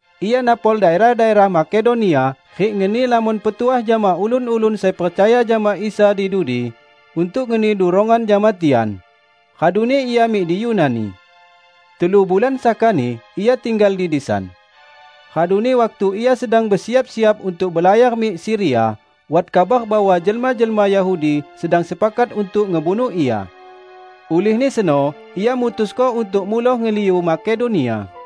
Ia napol daerah-daerah Makedonia rik ngeni lamon petuah jama ulun-ulun sai percaya jama Isa di dudi untuk ngeni durongan jama tian. Raduni ia mik di Yunani. Telu bulan sakani ia tinggal di disan. Raduni waktu ia sedang besiap-siap untuk belayar mik Siria, wat kabar bahwa jelma-jelma Yahudi sedang sepakat untuk ngebunuh ia. Ulihni seno ia mutusko untuk muloh ngeliu Makedonia.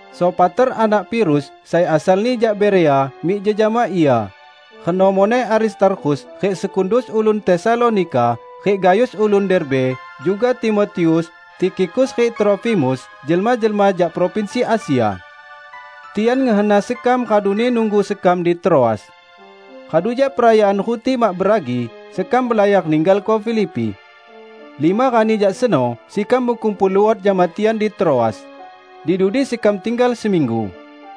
Sopater anak Pirus sai asalni jak Berea mik jejama ia; reno muneh Aristarkhus rik Sekundus ulun Tesalonika, rik Gayus ulun Derbe. Juga Timotius, Tikhikus rik Trofimus, jelma-jelma jak provinsi Asia. Tian ngehena sekam raduni nunggu sekam di Troas. Radu jak Perayaan Ruti Mak Beragi, sekam belayar ninggalko Filipi. Lima rani jak seno sekam bekumpul luot jama tian di Troas. Di dudi sekam tinggal seminggu.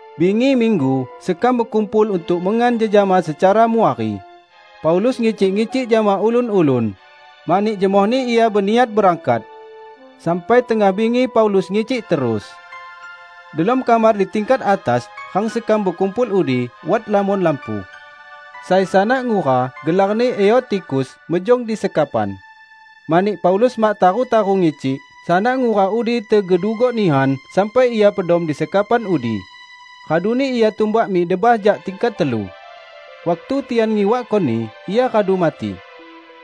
Bingi minggu sekam bekumpul untuk mengan jejama secara muwari. Paulus ngicik-ngicik jama ulun-ulun, mani jemohni ia beniat berangkat. Sampai tengah bingi Paulus ngicik terus. Delom kamar di tingkat atas, rang sekam bekumpul udi, wat lamon lampu. Sai sanak ngura gelarni Eutikhus mejong di sekapan. Mani Paulus mak taru-taru ngicik, sanak ngura udi tegedugok nihan sampai ia pedom di sekapan udi, raduni ia tumbak mik debah jak tingkat telu. Waktu tian ngiwakkoni, ia radu mati.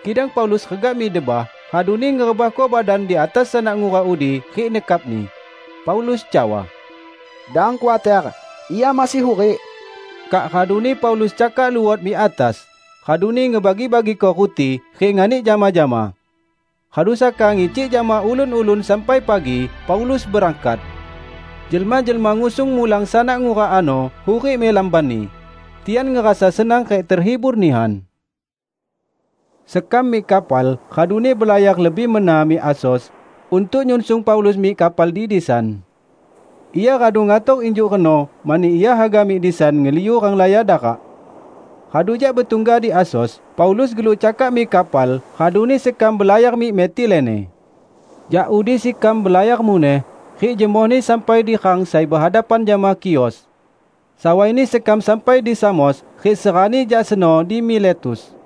Kidang Paulus regah mik debah, raduni ngerebahko badan di atas sanak ngura udi rik nekapni. Paulus cawa, "Dang khuater, ia masih hurik!" Kak raduni Paulus cakak luot mik atas, raduni ngebagi-bagiko ruti rik nganik jama-jama. Radu saka ngicik jama ulun-ulun sampai pagi, Paulus berangkat. Jelma-jelma ngusung mulang sanak ngura ano hurik mik lambanni. Tian ngerasa senang rik tehibur nihan. Sekam mik kapal raduni belayar lebih mena mik Asos untuk nyunsung Paulus mik kapal di disan. Ia radu ngator injuk reno mani ia haga mik disan ngeliu renglaya darak. Radu jak betungga di Asos, Paulus geluk cakak mik kapal raduni sekam belayar mik Metilene. Jak udi sekam belayar muneh, rik jemohni sampai di rang sai behadapan jama Khios. Sawaini sekam sampai di Samos rik serani jak seno di Miletus.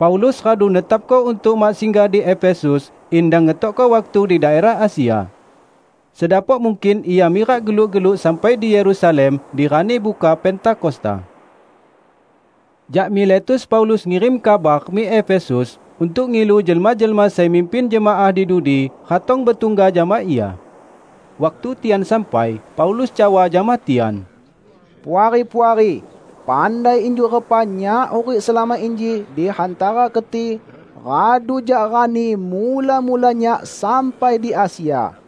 Paulus radu netapko untuk mak singgah di Efesus, in dang ngetokko waktu di daerah Asia. Sedapok mungkin ia mirak geluk-geluk sampai di Yerusalem di rani buka Pentakosta. Jak Miletus Paulus ngirim kabar mik Efesus untuk ngilu jelma-jelma sai mimpin jemaah di dudi ratong betungga jama ia. Waktu tian sampai, Paulus cawa jama tian, "Puari-puari pandai injuk repa nyak hurik selama inji di hantara keti radu jak rani mula-mula nyak sampai di Asia.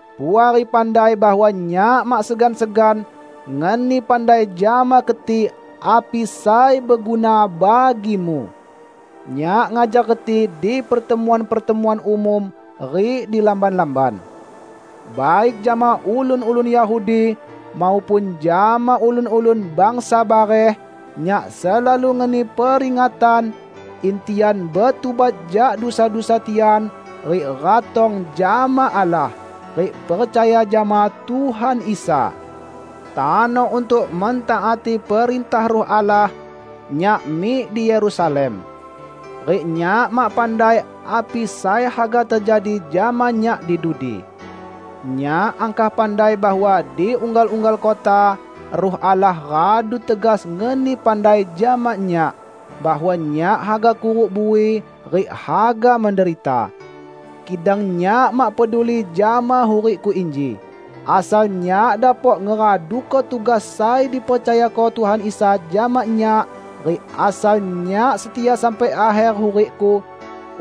Puari pandai bahwa nyak mak segan-segan ngeni pandai jama keti api sai beguna bagimu. Nyak ngajar keti di pertemuan-pertemuan umum rik di lamban-lamban. Baik jama ulun-ulun Yahudi maupun jama ulun-ulun bangsa bareh nyak selalu ngeni peringatan in tian betubat jak dusa-dusa tian rik ratong jama Allah, rik percaya jama Tuhan Isa. Tano untuk mentaati perintah Ruh Allah, nyak mik di Yerusalem. Rik nyak mak pandai api sai haga tejadi jama nyak di dudi. Nyak angkah pandai bahwa di unggal-unggal kota, Ruh Allah radu tegas ngeni pandai jama nyak, bahwa nyak haga kuruk bui rik haga menderita. Kidang nyak mak peduli jama hurikku inji, asal nyak dapok ngeraduko tugas sai dipercayako Tuhan Isa jama nyak rik asal nyak setia sampai akher hurikku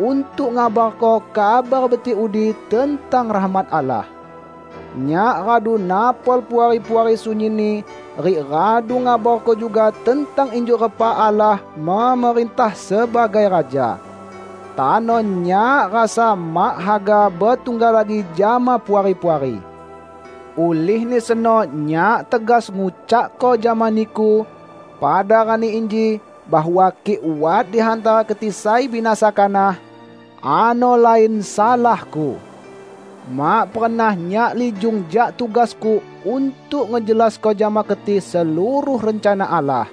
untuk ngabarko Kabar Betik udi tentang rahmat Allah. Nyak radu napol Puari-puari sunyinni rik radu ngabarko juga tentang injuk repa Allah memerintah sebagai Raja. Tano nyak rasa mak haga betungga lagi jama Puari-puari. Ulihni seno nyak tegas ngucakko jama niku pada rani inji bahwa kik wat di hantara keti sai binasa kanah, ano lain salahku. Mak pernah nyak lijung jak tugasku untuk ngejelasko jama keti seluruh rencana Allah.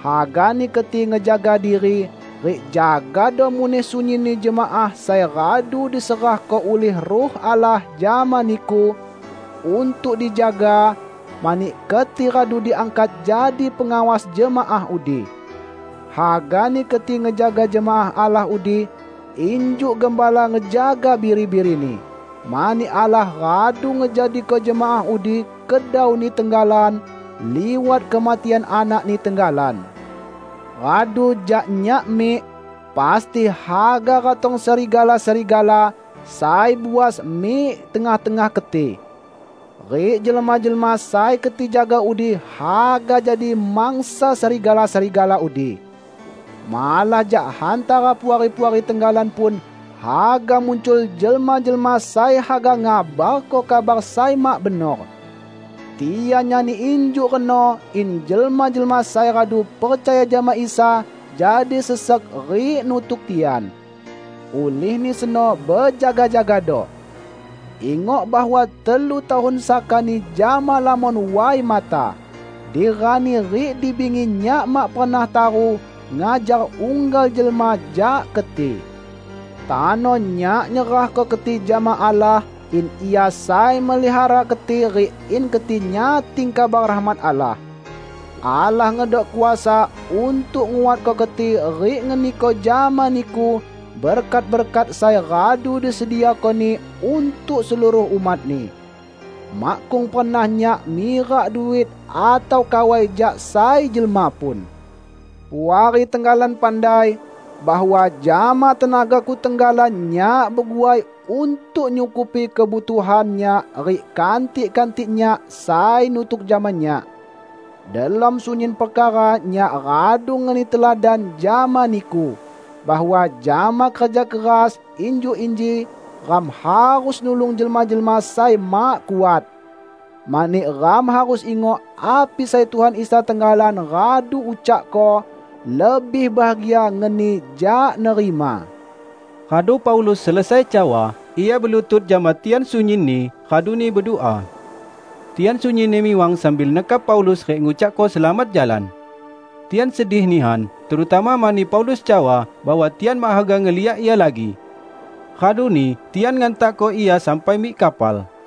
Hagani keti ngejaga diri rik jagado muneh sunyinni jemaah sai radu diserahko ulih Ruh Allah jama niku untuk dijaga; mani keti radu diangkat jadi pengawas jemaah udi. Hagani keti ngejaga jemaah Allah udi injuk gembala ngejaga biri-birini, mani Allah radu ngejadiko jemaah udi kedau-Ni tenggalan liwat kematian Anak-Ni tenggalan. Radu jak nyak mik, pasti haga ratong serigala-serigala sai buas mik tengah-tengah keti. Rik jelma-jelma sai keti jaga udi haga jadi mangsa serigala-serigala udi. Malah jak hantara Puari-puari tenggalan pun haga muncul jelma-jelma sai haga ngabarko kabar sai mak benor. Tian nyani injuk reno in jelma-jelma sai radu percaya jama Isa jadi sesek rik nutuk tian. Ulihni seno bejaga-jagado! Ingok bahwa telu tahun sakani jama lamon way mata, di rani rik di bingi nyak mak pernah taru ngajar unggal jelma jak keti. Tano nyak nyerahko keti jama Allah in Ia sai memelihara keti rik in keti nyating kabar rahmat Allah. Allah ngedok kuasa untuk nguatko keti rik ngeniko jama niku berkat-berkat sai radu disediako-Ni untuk seluruh umat-Ni. Makkung pernah nyak mirak duit atau kawai jak sai jelma pun. Puari tenggalan pandai, bahwa jama tenagaku tenggalan nyak beguai untuk nyukupi kebutuhan nyak rik kantik-kantik nyak sai nutuk jama nyak. Delom sunyin perkara nyak radu ngeni teladan jama niku bahwa jama kerja keras injuk inji ram harus nulung jelma-jelma sai mak kuat. Mani ram harus ingok api sai Tuhan Isa tenggalan radu ucakko, 'Lebih bahagia ngeni jak nerima.' " Radu Paulus selesai cawa, ia belutut jama tian sunyinni raduni bedua. Tian sunyinni miwang sambil nekap Paulus rik ngucakko selamat jalan. Tian sedih nihan, terutama mani Paulus cawa bahwa tian mak haga ngeliak ia lagi. Raduni tian ngantakko ia sampai mik kapal.